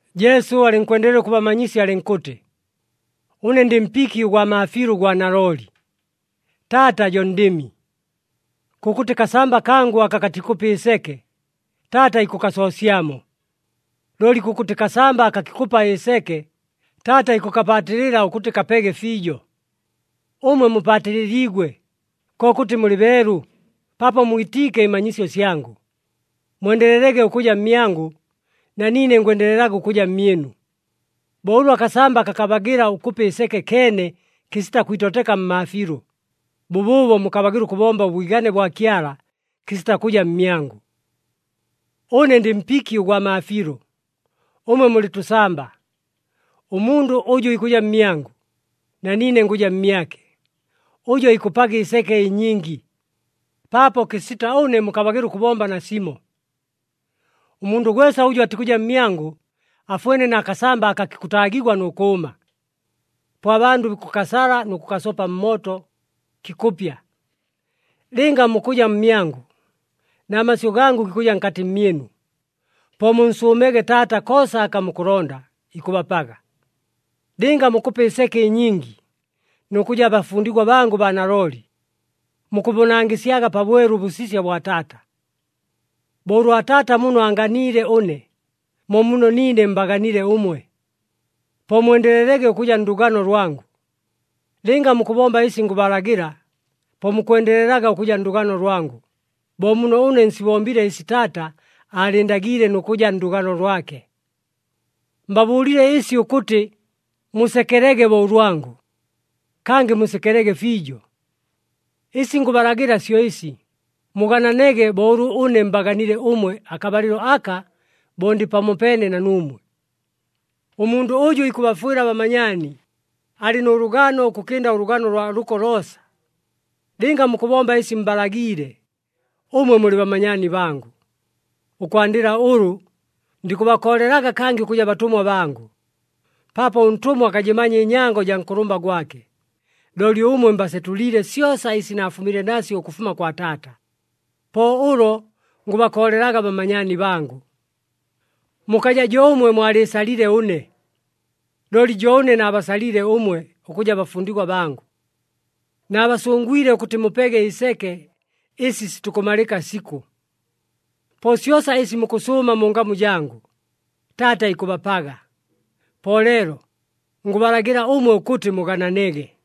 Jesu alɨnkwendelela ʉkʉbamanyisya alɨnkʉtɨ, “Ʉne ndɨ mpiki ʉgwa maafiilʉ ʉgwa nalooli, Taata jo ndɨmi. Kʉkʉtɨ kasamba kangʉ aka katikʉpa ɨseke, Taata ikʉkasoosyamo. Looli kʉkʉtɨ kasamba aka kikʉpa ɨseke, Taata ikʉkapaatɨlɨla ʉkʉtɨ kapege fiijo. Ʉmwe mupaatɨlɨliigwe, kokʉtɨ mulɨ beelu, paapo mwitiike ɨmanyisyo syangʉ. Mwendelelege ʉkʉja mmyangʉ, na niine ngwendelelaga ʉkʉja mmyɨnu. Bo ʉlʉ akasamba kakabagɨla ʉkʉpa ɨseke keene kɨsita kwitoteka mmaafiilʉ, bʉbʉʉbo mukabagɨla ʉkʉbomba ʉbwigane bwa Kyala kɨsita kʉja mmyangʉ. “Ʉne ndɨ mpiki ʉgwa maafiilʉ, ʉmwe mulɨ tʉsamba. Ʉmundʉ ʉjʉ ikʉja mmyangʉ, na niine ngʉja mmyake, ʉjo ikʉpaga ɨseke ɨnyingi, paapo kɨsita ʉne mukabagɨla ʉkʉbomba nasimo. Ʉmundʉ gwesa ʉjʉ atikʉja mmyangʉ afwene na kasamba aka kikʉtaagigwa nʉ kʉʉma. Po abandʉ bikʉkasala nʉ kʉkasopa mmooto, kikʉpya. Lɨnga mukʉja mmyangʉ na masyʉ gangʉ gikʉja nkatɨ mmyɨnu, po munsʉʉmege Taata koosa aka mukʉlonda, ikʉbapaga. Lɨnga mukʉpa ɨseke ɨnyingi, nʉ kʉja bafundigwa bangʉ baa nalooli, mukʉbʉnangɨsyaga pabwelu ʉbʉsisya bwa Taata. Bo ʉlwa Taata muno aanganiile ʉne, mo muno niine mbaganile ʉmwe. Po mwendelelege ʉkʉja ndʉgano lwangʉ. Lɨnga mukʉbomba ɨsi ngʉbalagɨla, po mukwendelelaga ʉkʉja ndʉgano lwangʉ, bo muno ʉne nsibombile ɨsi Taata aalɨɨndagiile nʉ kʉja ndʉgano lwake. “Mbabʉʉlile ɨsi ʉkʉtɨ musekelege bo ʉlwangʉ, kangɨ musekelege fiijo. Ɨsi ngʉbalagɨla syo ɨsi, mugananege bo ʉlʉ ʉne mbaganile ʉmwe akabalɨlo aka bo ndɨ pamopeene na nuumwe. Ʉmundʉ ʉjʉ ikʉbafwɨla abamanyaani, alɨ nʉ lʉgano ʉkʉkɨnda ʉlʉgano ʉlwa lʉko loosa. Lɨnga mukʉbomba ɨsi mbalagiile, ʉmwe mulɨ bamanyaani bangʉ. Ʉkwandɨla ʉlʉ, ndikʉbakoolelaga kangɨ ʉkʉja batʉmwa bangʉ, paapo ʉntʉmwa akajɨmanya ɨnyango jaa nkʉlʉmba gwake. Looli ʉmwe mbasetʉliile syosa ɨsi naafumile nasyo ʉkʉfuma kwa Taata, po ʉlo ngʉbakoolelaga bamanyaani bangʉ. Mukaja jo ʉmwe mwalɨɨsalile ʉne, looli jo ʉne naabasalile ʉmwe ʉkʉja bafundigwa bangʉ. Naabasʉngwile ʉkʉtɨ mupege ɨseke ɨsi sitikʉmalɨka sikʉ. Po syosa ɨsi mukʉsʉʉma mu ngamu jangʉ, Taata ikʉbapaga. Po leelo ngʉbalagɨla ʉmwe ʉkʉtɨ mugananege.”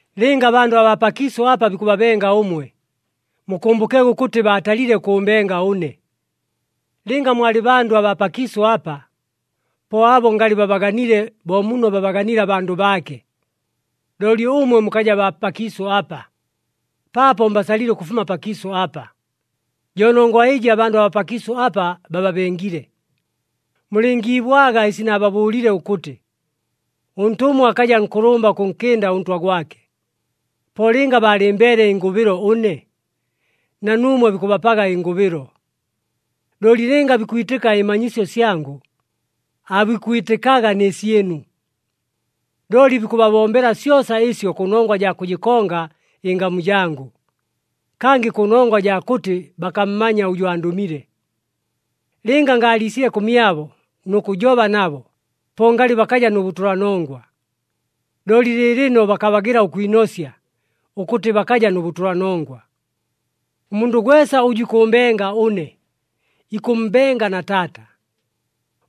“Lɨnga abandʉ abaa pakiisʉ apa bikʉbabenga ʉmwe, mukʉmbʉkege ʉkʉtɨ baatalile ʉkʉʉmbenga ʉne. Lɨnga mwalɨ bandʉ abaa pakiisʉ apa, po abo ngalɨ babaganile bo muno babaganiile abandʉ baake. Looli ʉmwe mukaja baa pakiisʉ apa, paapo mbasalile ʉkʉfuma pakiisʉ apa, jo nongwa ɨjɨ abandʉ abaa pakiisʉ apa bababengile. Mulɨngiibwaga ɨsi naababʉʉlile ʉkʉtɨ, ‘Ʉntʉmwa akaja nkʉlʉmba ʉkʉnkɨnda ʉntwa gwake.’ Po lɨnga baalɨmbeele ɨngʉbɨlo ʉne, na nuumwe bikʉbapaga ɨngʉbɨlo, looli lɨnga bikwitɨka ɨmanyisyo syangʉ, aabikwitɨkaga nɨ syɨnu. Looli bikʉbabombela syosa ɨsyo kʉnongwa jaa kʉjɨkonga ɨngamu jangʉ, kangɨ kʉnongwa jaa kʉtɨ bakammanya ʉjʉ andʉmile. Lɨnga ngaaliisile kʉmyabo nʉ kʉjoba nabo, po ngalɨ bakaja nʉ bʉtʉlanongwa. Looli lɨɨlɨno, bakabagɨla ʉkwinosya ʉkʉtɨ bakaja nʉ bʉtʉlanongwa. “Ʉmundʉ gwesa ʉjʉ ikʉʉmbenga ʉne, ikʉmmbenga na Taata.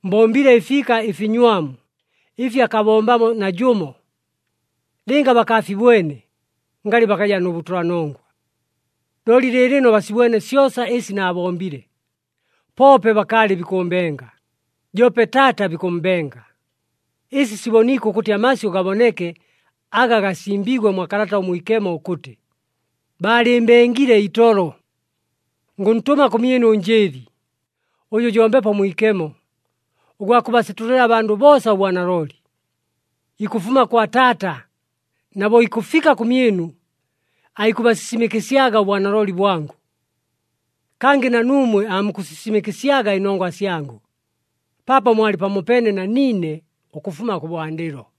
Mbombile ɨfiika ɨfinywamu ɨfi akabombamo najʉmo. Lɨnga bakaafibwene, ngalɨ bakaja nʉ bʉtʉlanongwa. Looli lɨɨlɨno basibwene syosa ɨsi naabombile, poope bakaalɨ bikʉʉmbenga, joope Taata bikʉmmbenga. Ɨsi siboniike ʉkʉtɨ amasyʉ gaboneke aga gasimbiigwe mwa Kalata ʉMwikemo ʉkʉtɨ, ‘Baalɨɨmbengile itolo.’ “Ngʉntʉma kʉmyɨnu ʉNjɨɨli, ʉjʉ jo Mbepo Mwikemo, ʉgwa kʉbasetʉlɨla abandʉ boosa ʉbwanalooli. Ikʉfuma kwa Taata, na bo ikʉfika kʉmyɨnu aikʉbasisimɨkɨsyaga ʉbwanalooli bwangʉ. Kangɨ na nuumwe aamukʉsisimɨkɨsyaga ɨnongwa syangʉ, paapo mwalɨ pamopeene na niine ʉkʉfuma kʉbwandɨlo.”